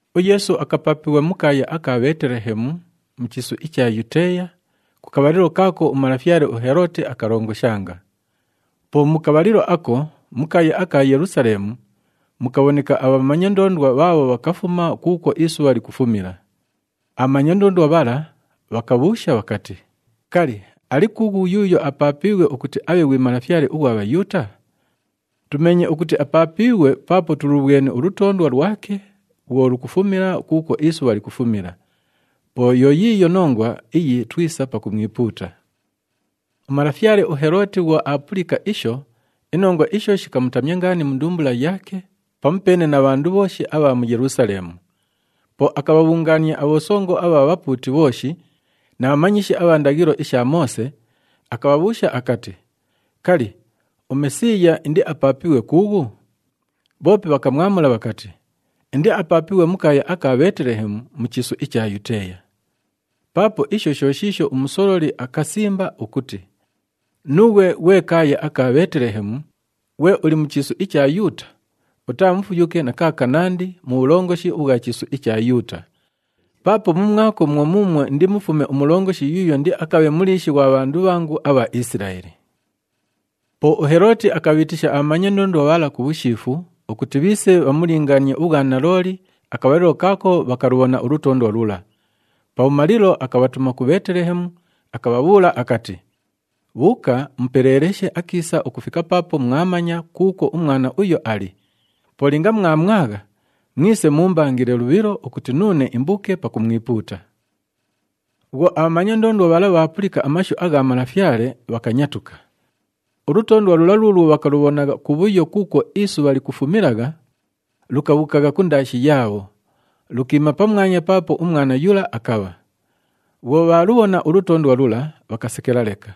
UYeesu akapaapighwa mu kaaya aka Bheetelehemu, mu chiisu icha Yuteeya, ku kabhalilo kaako umalafyale uHelooti akalongoshanga. Po mu kabhalilo ako, mu kaaya aka Yelusaleemu mukabhoneka abhamanya ndoondwa bhaabho bhakafuma kuukwo isubha likufumila. Abhamanya ndoondwa bhala bhakabhuusha bhakati, “Kali, ali kuughu yuuyo apaapiighwe ukuti abhe ghwi Malafyale ughwa Bhayuuta? Tumeenye ukuti apaapiighwe paapo tulubhweni ulutoondwa lwake bhwo lukufumila kuukwo isubha likufumila. Po yo yiiyo nongwa iyi twisa pakumwipuuta.” Umalafyale uHelooti bhwo aapulika isho, inongwa isho shikamutamya ngaani mu ndumbula yaake pamupeene na bhandu bhooshi abha mu Yelusaleemu. Po akabhabhungaania abhosongo abha bhapuuti bhooshi na bhamanyishi abha ndaghilo isha Moose, akabhabhuusha akati, “Kali, uMesiiya indiapaapighwe kuughu?” Bhoope bhakamwamula bhakati, “Indiapaapighwe mu kaaya aka Bheetelehemu, mu chiisu icha Yuteeya. Paapo isho sho shiisho umusololi akasimba ukuti, ‘Nuughwe ghwe kaaya aka Bheetelehemu, ghwe uli mu chiisu icha Yuuta, utaa mufuyuke na kaakanandi mu bhulongoshi ubhwa chiisu icha Yuuta! Paapo mumwako mwo muumwo indimufume umulongoshi yuuyo indiakabhe muliishi ghwa bhandu bhangu abha Isilaeli.’” Po uHelooti akabhiitisha abhamanya ndoondwa bhala ku bhushiifu ukuti bhiise bhamulingaanie ubhwanalooli akabhalilo kaako bhakalubhona ulutoondwa lula. Pabhumalilo, akabhatuma ku Bheetelehemu, akabhabhuula akati, “Bhuuka mupeleeleshe akiisa ukufika paapo mwamanya kuukwo umwana uyo ali. Po linga mwamwagha, mwise muumbangile lubhilo ukuti nuune imbuuke pakumwipuuta.” Bhwo abhamanya ndoondwa bhala bhaapulika amashu agha malafyale, bhakanyatuka. Ulutoondwa lula luulwo bhakalubhonagha kubhuyo kuukwo isubha likufumilagha, lukabhuukagha kundaashi yaabho, lukiima pamwanya paapo umwana yula akabha. Bhwo bhaalubhona ulutoondwa lula, bhakasekela leka.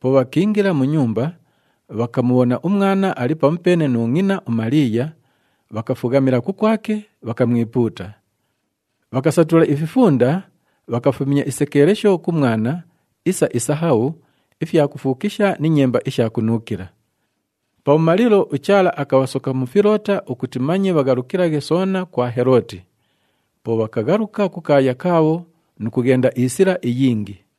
Po bhakiingila mu nyumba, bhakamubhona umwana ali pamupeene nu ngʼina uMaliiya, bhakafughamila kukwake, bhakamwipuuta. Bhakasatula ififunda, bhakafumya isekeelesho ku mwana isa isahabhu, ifyakufuukisha ni nyemba isha kunuukila. Pabhumalilo, uChaala akabhasoka mu filoota ukuti manye bhaghalukilaghe soona kwa Helooti. Po bhakaghaluka ku kaaya kaabho nu kughenda isila iyingi.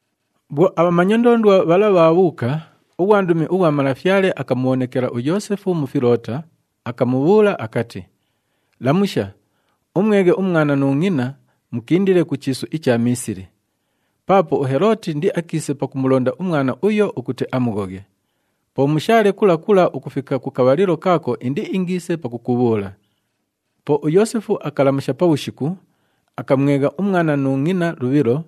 Bhwo abhamanya ndoondwa bhala bhaabhuuka, ughwandumi ughwa Malafyale akamubhonekela uYoosefu mu filoota, akamubhuula akati, “Lamusha, umweghe umwana nu ngʼina, mukindile ku chiisu icha Miisili. Paapo uHelooti indiakiise pakumulonda umwana uyo ukuti amughoghe. Po mushaale kula kula ukufika ku kabhalilo kaako indiingiise pakukubhuula.” Po uYoosefu akalamusha pabhushiku, akamwegha umwana nu ngʼina lubhilo,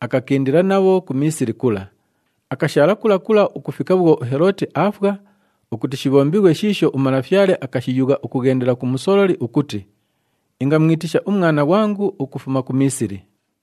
akakindila nabho ku Miisili kula, akashaala kula kula ukufika bhwo uHelooti aafwa ukuti shibhombighwe shiisho uMalafyale akashiyugha ukughendela ku musololi ukuti, “Ingamwitisha umwana ghwangu ukufuma ku Miisili.”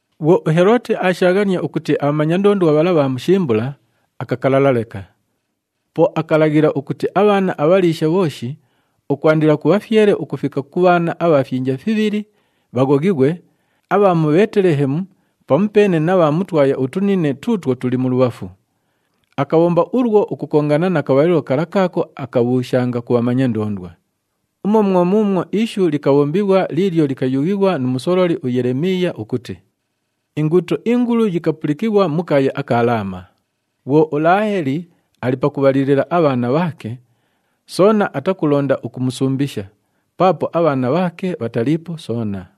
Bhwo uHelooti aashaaghania ukuti abhamanya ndoondwa bhala bhaamushimbula, akakalala leka. Po akalaghila ukuti abhaana abhaliisha bhooshi ukwandila ku bhafyele ukufika ku bhaana abha fyinja fibhili, bhaghoghighwe, abha mu Bheetelehemu pamupeene na bha mu twaya utunine tuutwo tuli mulubhafu. Akabhomba ulwo ukukongana na kabhalilo kala kaako akabhuushanga ku bhamanya ndoondwa. Umwo mwo muumwo ishu likabhombighwa liilyo likayughighwa nu musololi uYelemiiya ukuti, “Inguuto ingulu yikapulikighwa mu kaaya aka Laama. Bhwo uLaaheli ali pakubhalilila abhaana bhaake, soona atakulonda ukumusumbisha, paapo abhaana bhaake bhataliipo soona.”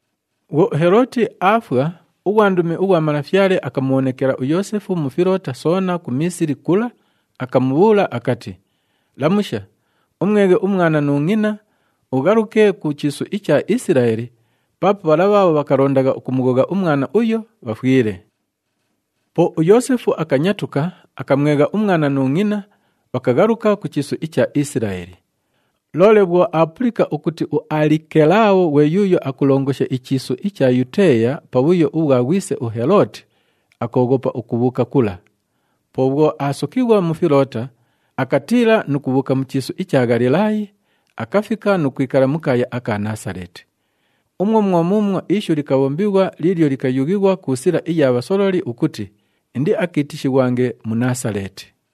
Bhwo uHelooti aafwa, ughwandumi ughwa Malafyale akamubhonekela uYoosefu mu filoota soona ku Miisili kula, akamubhuula akati, “Lamusha, umweghe umwana nu ngʼina, ughaluke ku chiisu icha Isilaeli paapo bhala bhaabho bhakalondagha ukumughogha umwana uyo, bhafwile.” Po uYoosefu akanyatuka, akamwegha umwana nu ngʼina, bhakaghaluka ku chiisu icha Isilaeli. Loole bhwo aapulika ukuti uAlikelaabho ghwe yuuyo akulongosha ichiisu icha Yuteeya pa bhuyo ubhwa ghwise uHelooti, akooghopa ukubhuuka kula. Po bhwo aasokighwa mu filoota, akatiila nu kubhuuka mu chiisu icha Ghalilaayi, akafika nu kwikala mu kaaya aka Naasaleeti. Umwo mwo muumwo ishu likabhombighwa liilyo likayughighwa ku sila iya bhasololi ukuti, “Indiakiitishighwange Munaasaleeti.”